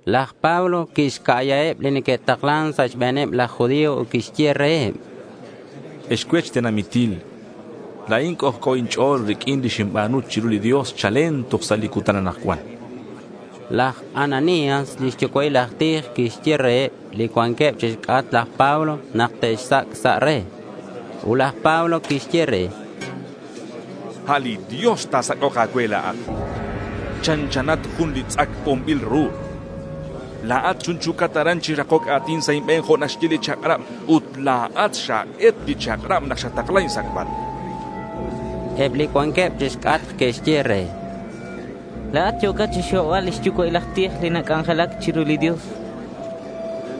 Laj Pablo quixca'yaheb li neque'taklan sa' xbe̱neb laj judío ut quixye reheb: —Ex cuech tenamitil, la̱in c'ojc'o inch'o̱l riq'uin li xinba̱nu chiru li Dios chalen toj sa' li cutan anakcuan, chan. Laj Ananías li xyucua'il aj tij quixye reheb li cuanqueb chixc'atk laj Pablo nak te'xsac' sa' re. Ut laj Pablo quixye re: —A' li Dios ta̱sac'ok a̱cue la̱at. Chanchanat jun li tz'ac bonbil ru. La̱at chunchu̱cat aran chi rakoc a̱tin sa' inbe̱n jo' naxye li chak'rab. Ut la̱at xak'et li chak'rab nak xatakla insac'bal, chan. Eb li cuanqueb chixc'atk que'xye re: —La̱at yo̱cat chixhobbal li xyucua'il aj tij li nac'anjelac chiru li Dios, chanqueb.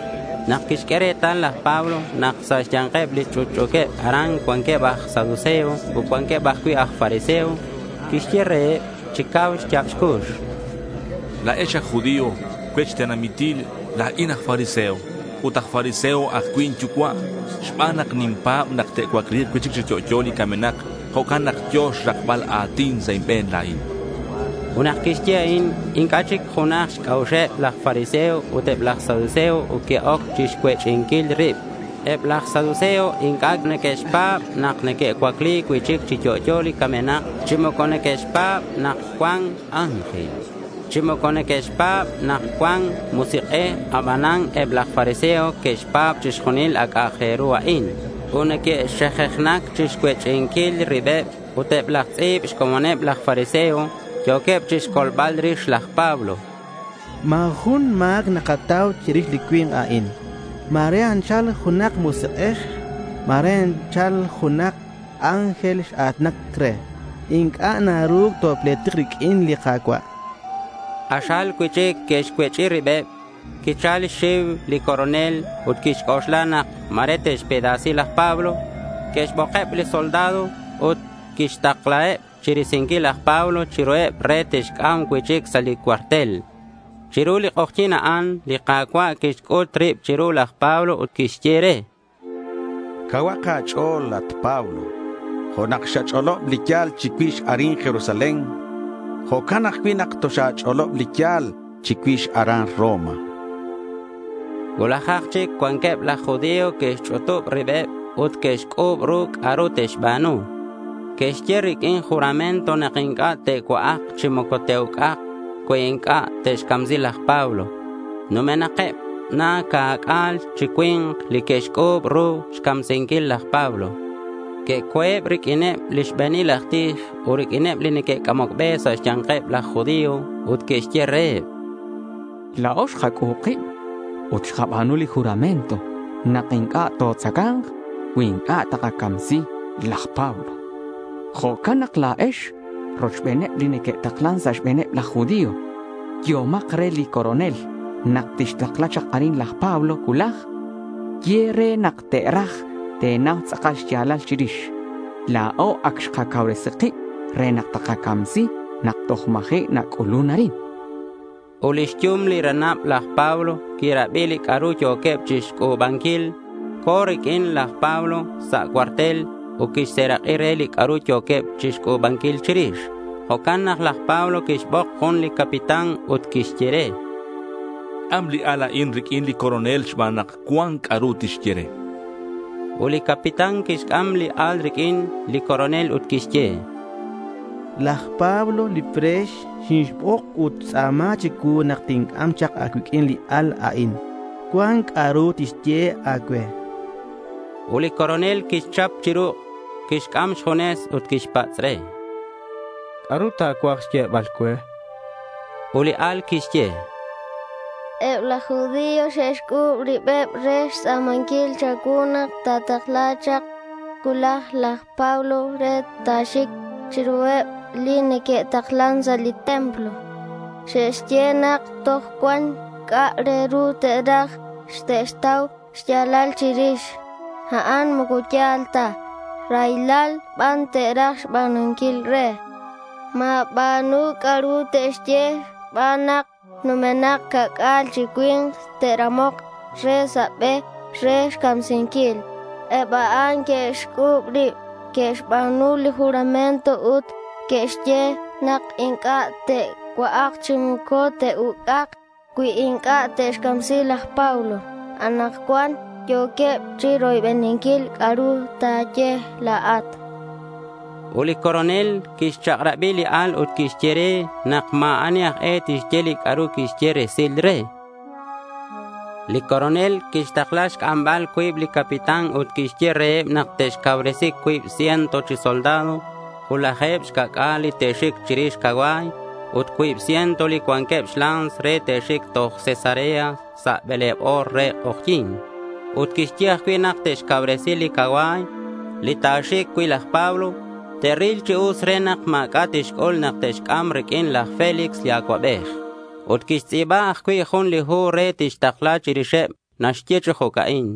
Nak quixq'ue retal laj Pablo nak sa' xya̱nkeb li ch'utch'u̱queb aran cuanqueb aj saduceo ut cuanqueb ajcui' aj fariseo, quixye reheb chi cau xya̱b xcux: —La̱ex aj judío, cuech tenamitil, la̱in aj fariseo. Ut aj fariseo ajcui' inyucua'. Xban nak ninpa̱b nak te'cuacli̱k cui'chic chi yo'yo li camenak, jo'can nak yo̱ xrakbal a̱tin sa' inbe̱n la̱in, chan laj Pablo. Ut nak quixye a'in, inc'a' chic junaj xc'a'uxeb laj fariseo ut eb laj saduceo ut que'oc chixcuech'inquil rib. Eb laj saduceo inc'a' neque'xpa̱b nak neque'cuacli cui'chic chi yo'yo li camenak, chi moco neque'xpa̱b nak cuan ángel, chi moco neque'xpa̱b nak cuan Musik'ej. Abanan eb laj fariseo neque'xpa̱b chixjunil a' c'a'ak re ru a'in. Ut neque'xejejnac chixcuech'inquil ribeb. Ut eb laj tz'i̱b xcomoneb laj fariseo yo̱queb chixcolbal rix laj Pablo. —Ma̱ jun ma̱c nakatau chirix li cui̱nk a'in. Ma̱re anchal junak musik'ej, ma̱re anchal junak ángel x-a̱tinan re. Inc'a' naru topletik riq'uin li Ka̱cua', chanqueb. K'axal cui'chic que'xcuech'i ribeb. Quichal xxiu li coronel ut quixc'oxla nak ma̱re te'xpedasi laj Pablo. Quixbokeb li soldado ut quixtaklaheb chirisinquil laj Pablo chiruheb re te'xc'am cui'chic sa' li cuartel. Chiru li k'ojyi̱n a'an li Ka̱cua' quixc'ut rib chiru laj Pablo ut quixye re: —Cauhak a̱ch'o̱l, at Pablo. Jo' nak xach'olob li ya̱l chicuix arin Jerusalén, jo'can ajcui' nak toxa̱ch'olob li ya̱l chicuix aran Roma, chan. Cuulajak chic cuanqueb laj judío que'xch'utub ribeb ut que'xc'u̱b ru c'a'ru te'xba̱nu. Que'xye riq'uin juramento nak inc'a' te'cua'ak chi moco te'uc'ak cui inc'a' te'xcamsi laj Pablo. Numenakeb na ca'c'a̱l chi cui̱nk li que'xc'u̱b ru xcamsinquil laj Pablo. Que'co̱eb riq'uineb li xbe̱nil aj tij ut riq'uineb li neque'c'amoc be sa' xya̱nkeb laj judío ut que'xye reheb: —La̱o xkac'u̱b kib ut xkaba̱nu li juramento nak inc'a' totzaca̱nk cui inc'a' takacamsi laj Pablo. Jo'can nak la̱ex rochbeneb li neque'taklan sa' xbe̱neb laj judío yehomak re li coronel nak tixtakla chak arin laj Pablo cuulaj. Ye re nak te̱raj te̱nau tz'akal xya̱lal chirix. La̱o ac xkacauresi kib re nak takacamsi nak toj ma̱ji' nac'ulun arin, chanqueb. Ut lix yum li ranab laj Pablo quirabi li c'a'ru yo̱queb chixc'u̱banquil. Co̱ riq'uin laj Pablo sa' cuartel ut quixserak'i re li c'a'ru yo̱queb chixc'u̱banquil chirix. Jo'can nak laj Pablo quixbok jun li capitán ut quixye re: —C'am li al a'in riq'uin li coronel xban nak cuan c'a'ru tixye re, chan. Ut li capitán quixc'am li al riq'uin li coronel ut quixye: —Laj Pablo li pre̱x xinixbok ut xtz'a̱ma chicuu nak tinc'am chak a̱cuiq'uin li al a'in. Cuan c'a'ru tixye a̱cue, chan. Ut li coronel quixchap chi ruk'. Quixc'am xjunes ut quixpatz' re: —¿C'a'ru ta̱cuaj xyebal cue? chan re. Ut li al quixye: —Eb laj judío xe'xc'u̱b ribeb re xtz'a̱manquil cha̱cuu nak ta̱takla cuulaj laj Pablo re ta̱xic chiruheb li neque'taklan sa' li templo. Xe'xye nak toj cuan c'a' re ru te'raj te'xtau xya̱lal chirix. A'an moco ya̱l ta. Raylal ban te'raj xba̱nunquil re. Ma̱ba̱nu c'a'ru te'xye xban nak numenak ca'c'a̱l chi cui̱nk te'ramok re sa' be re xcamsinquil. Eb a'an que'xc'u̱b rib. Que'xba̱nu li juramento ut que'xye nak inc'a' te'cua'ak chi moco te'uc'ak cui inc'a' te'xcamsi laj Pablo. Anakcuan yo̱queb chiroybeninquil c'a'ru ta̱ye la̱at, chan li al. Ut li coronel quixchak'rabi li al ut quixye re nak ma̱ ani aj e tixye li c'a'ru quixye resil re. Li Coronel quixtakla xc'ambal cuib li capitán ut quixye reheb nak te'xcauresi cuib ciento chi soldado, ut laje̱b xca̱c'a̱l li te'xic chirix cacua̱y ut cuib ciento li cuanqueb xla̱ns re te'xic toj Cesarea sa' bele̱b o̱r re k'ojyi̱n. Ut quixye ajcui' nak te'xcauresi li cacua̱y li ta̱xic cui' laj Pablo. Te'ril chi us re nak ma̱c'a' tixc'ul nak te'xc'am riq'uin laj Félix li acuabej. Ut quixtz'i̱ba ajcui' jun li hu re tixtakla chirixeb. Naxye chi jo'ca'in: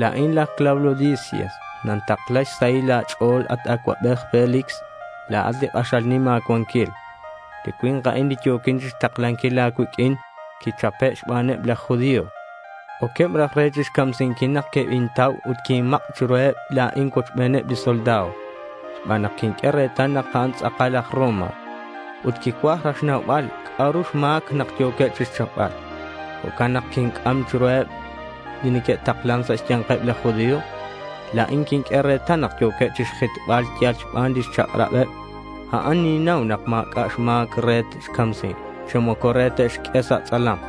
La̱in laj Claudio Lisias. Nintakla xsahil a̱ch'o̱l, at acuabej Félix. La̱at li k'axal nim a̱cuanquil. Li cui̱nk a'in li yo̱quin chixtaklanquil a̱cuiq'uin quichape' xbaneb laj judío. Oqueb raj re chixcamsinquil nak quebintau ut quinmak' chiruheb la̱in cuochbeneb li soldado xban nak quinq'ue retal nak a'an tz'akal aj Roma. Ut quicuaj raj xnaubal c'a'ru xma̱c nak yo̱queb chixchapbal. Jo'can nak quinc'am chiruheb li neque'taklan sa' xya̱nkeb laj judío. La̱in quiq'ue retal nak yo̱queb chixjitbal yal xban lix chak'rabeb a'an. Ninnau nak ma̱c'a' xma̱c re te'xcamsi, chi moco re te'xq'ue sa' tz'alam.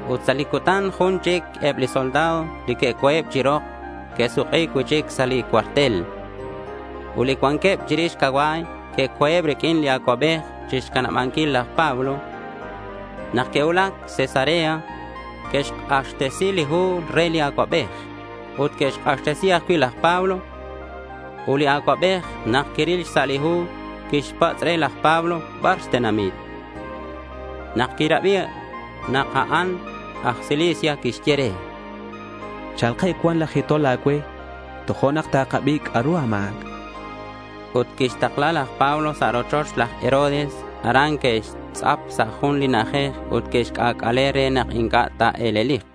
Ut sa' li cutan jun chic eb li soldado li que'co̱eb chi rok que'suk'i cui'chic sa' li cuartel. Ut eb li cuanqueb chirix cacua̱y que'co̱eb riq'uin li acuabej chixcanabanquil laj Pablo. Nak que'cuulac Cesarea, que'xk'axtesi li hu re li acuabej, ut que'xk'axtesi ajcui' laj Pablo. Ut li acuabej nak quiril xsa' li hu, quixpatz' re laj Pablo bar xtenamit. Nak quirabi nak a'an aj Cilicia, quixye re: —Cha̱lkeb cuan laj jitol a̱cue, tojo'nak takabi c'a'ru a̱ma̱c, chan re. Ut quixtakla laj Pablo sa' rochoch laj Herodes. Aran que'xtz'ap sa' jun li na'ajej ut que'xc'ac'ale re nak inc'a' ta̱e̱lelik.